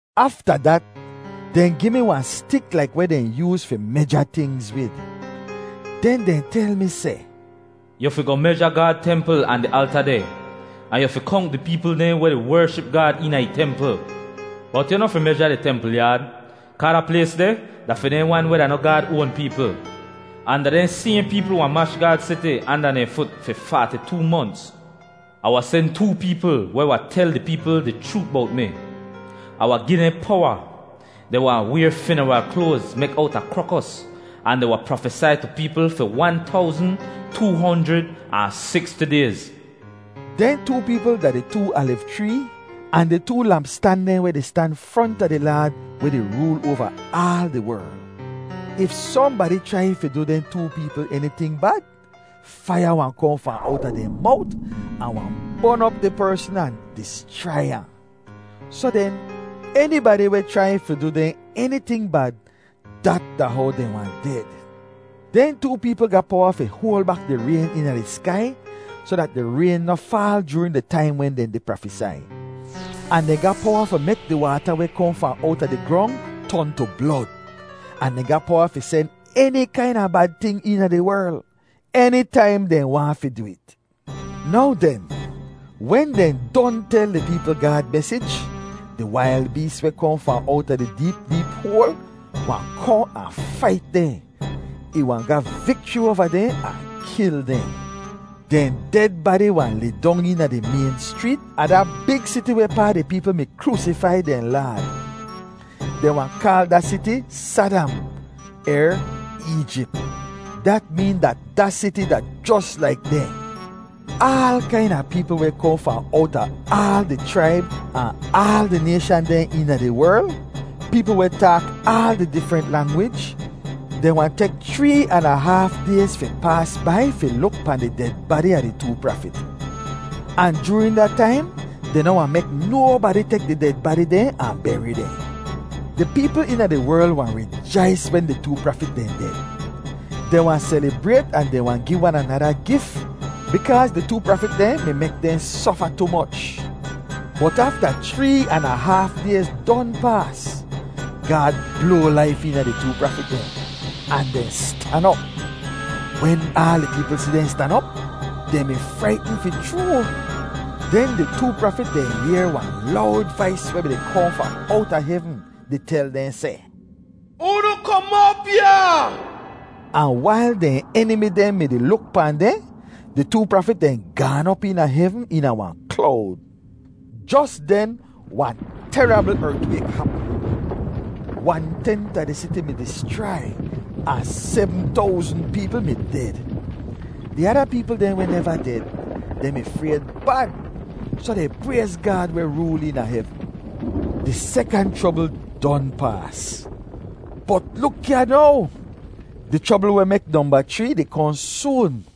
Afta dat, dehn gi mi wahn stik laik weh dehn yooz fi meja tingz wid. Den dehn tel mi seh, “Yu fi goh meja Gaad templ ahn di alta deh. Ahn yu fi konk di peepl dehn weh di wership Gaad eena ih templ. Bot yu noh fi meja di templ yaad, kaa da plays deh da fi dehn wan weh da noh Gaad oan peepl. Ahn da dehn sayhn peepl wahn mash Gaad siti anda dehn fut fi faati-too monts. Ah wahn sen too peepl weh wahn tel di peepl di chroot bowt mi. Ah wahn gi dehn powa. Dehn wahn wayr finaral kloaz mek owta krokos, ahn dehn wahn prafesai tu peepl fi wan towzn, too honjrid ahn siksti dayz.” Dehn too peepl da di too aliv chree ahn di too lampstan dehn weh di stan fronta di Laad weh di rool oava aal di werl. If sohnbadi chrai fi du dehn too peepl eniting bad, faiya wahn kohn fahn owta dehn mowt ahn wahn bon op di persn ahn dischrai ahn. Soh den enibadi weh chrai fi du dehn eniting bad, dat da how dehn wahn ded. Dehn too peepl ga powa fi hoal bak di rayn eena di skai soh dat di rayn noh faal joorin di taim wen dehn di prafesai. Ahn dehn ga powa fi mek di waata weh kohn fahn owta di grong ton tu blod. Ahn dehn ga powa fi sen eni kaina bad ting eena di werl, enitaim dehn waahn fi du it. Now den, wen dehn don tel di peepl Gaad mesij, di wail bees weh kohn fahn owta di deep deep hoal wahn kohn ahn fait dehn. Ih wahn ga vikchri oava dehn ahn kil dehn. Dehn ded badi wahn lidong eena di mayn schreet a da big siti wehpaa di peepl mi kroosifai dehn Laad. Dehn wahn kaal da siti “Sadam” er “Eejip.” Dat meen dat da siti da jos laik dehn. Aal kaina peepl weh kohn fahn owta aal di chraib ahn aal di nayshan dehn eena di werl, peepl weh taak aal di difrent langwij, dehn wahn tek chree an a haaf dayz fi paas bai fi luk pahn di ded badi a di too prafit. Ahn joorin da taim dehn noh wahn mek nobadi tek di ded badi dehn ahn beri dehn. Di peepl eena di werl wahn rijais wen di too prafit dehn ded. Dehn wahn selibrayt ahn dehn wahn gi wan anada gif, bikaaz di too prafit dehn mi mek dehn sofa tu moch. Bot afta chree an a haaf dayz don paas, Gaad bloa laif eena di too prafit dehn, ahn dehn stan op. Wen aal di peepl si dehn stan op, dehn mi fraitn fi chroo. Den di too prafit dehn yehr wahn lowd vais weh mi-di kohn fahn owta hevn di tel dehn seh, “Unu kom op ya!” Ahn wail dehn enimi dehn mi-di luk pahn dehn, di too prafit dehn gaan op eena hevn eena wahn klowd. Jos den, wahn terabl ertwayk hapm. Wan-tent a di siti mi dischrai, ahn sebm towzn peepl mi ded. Di ada peepl dehn weh neva ded, dehn mi frayd bad, soh dehn prayz Gaad weh rool eena hevn. Di sekant chrobl don paas. Bot luk ya now! Di chrobl weh mek nomba chree di kohn soon.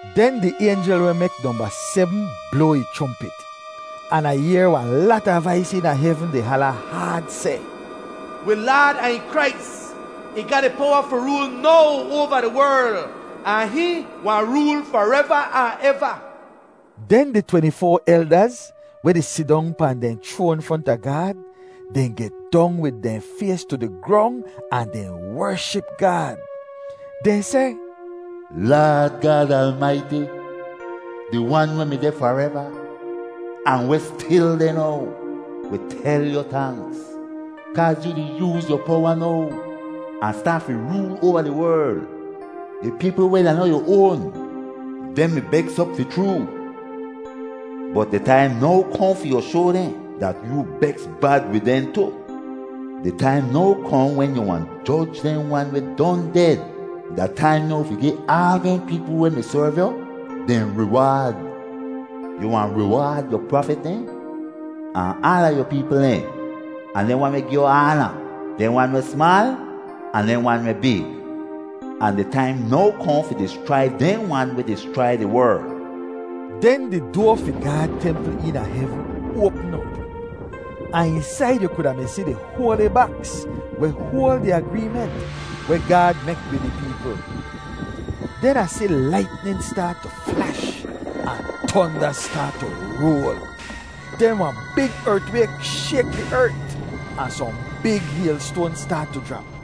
Den di aynjel weh mek nomba sebm bloa ih chrompit. An Ah yehr wahn lata vais eena hevn di hala haad seh, “Wi Laad ahn ih Krais, ih ga di powa fi rool now oava di werl. Ahn hihn wahn rool fareva ahn eva!” Den di tweni-foa eldaz, weh di sidong pahn dehn chroan fronta Gaad, dehn get dong wid dehn fays tu di grong ahn dehn wership Gaad. Dehn seh, “Laad Gaad Almaiti, di Wan weh mi deh fareva, ahn weh stil deh now, wi tel yu tanks, kaaz yu di yooz yu powa now, ahn staat fi rool oava di werl! Di peepl weh da noh yu oan, dehn mi beks op fi chroo. Bot di taim now kohn fi yu shoa dehn dat yoo beks bad wid dehn tu. Di taim now kohn wen yu wahn joj dehn wan weh don ded. Da taim now fi gi aal dehn peepl weh mi serv yu dehn riwaad. Yu wahn riwaad yu prafit dehn, ahn aala yu peepl dehn, ahn dehn wan weh gi yu aana, dehn wan weh smaal, ahn dehn wan weh big. Ahn di taim now kohn fi dischrai dehn wan weh dischrai di werl!” Den di doa fi Gaad templ eena hevn oapm op. Ahn eensaid yu kuda mi si di hoali baks weh hoal di agreement weh Gaad mek wid ih peepl. Den Ah si laitnin staat tu flash ahn tonda staat tu roal. Den wahn big ertwayk shayk di ert ahn sohn big haylstoan staat tu jrap.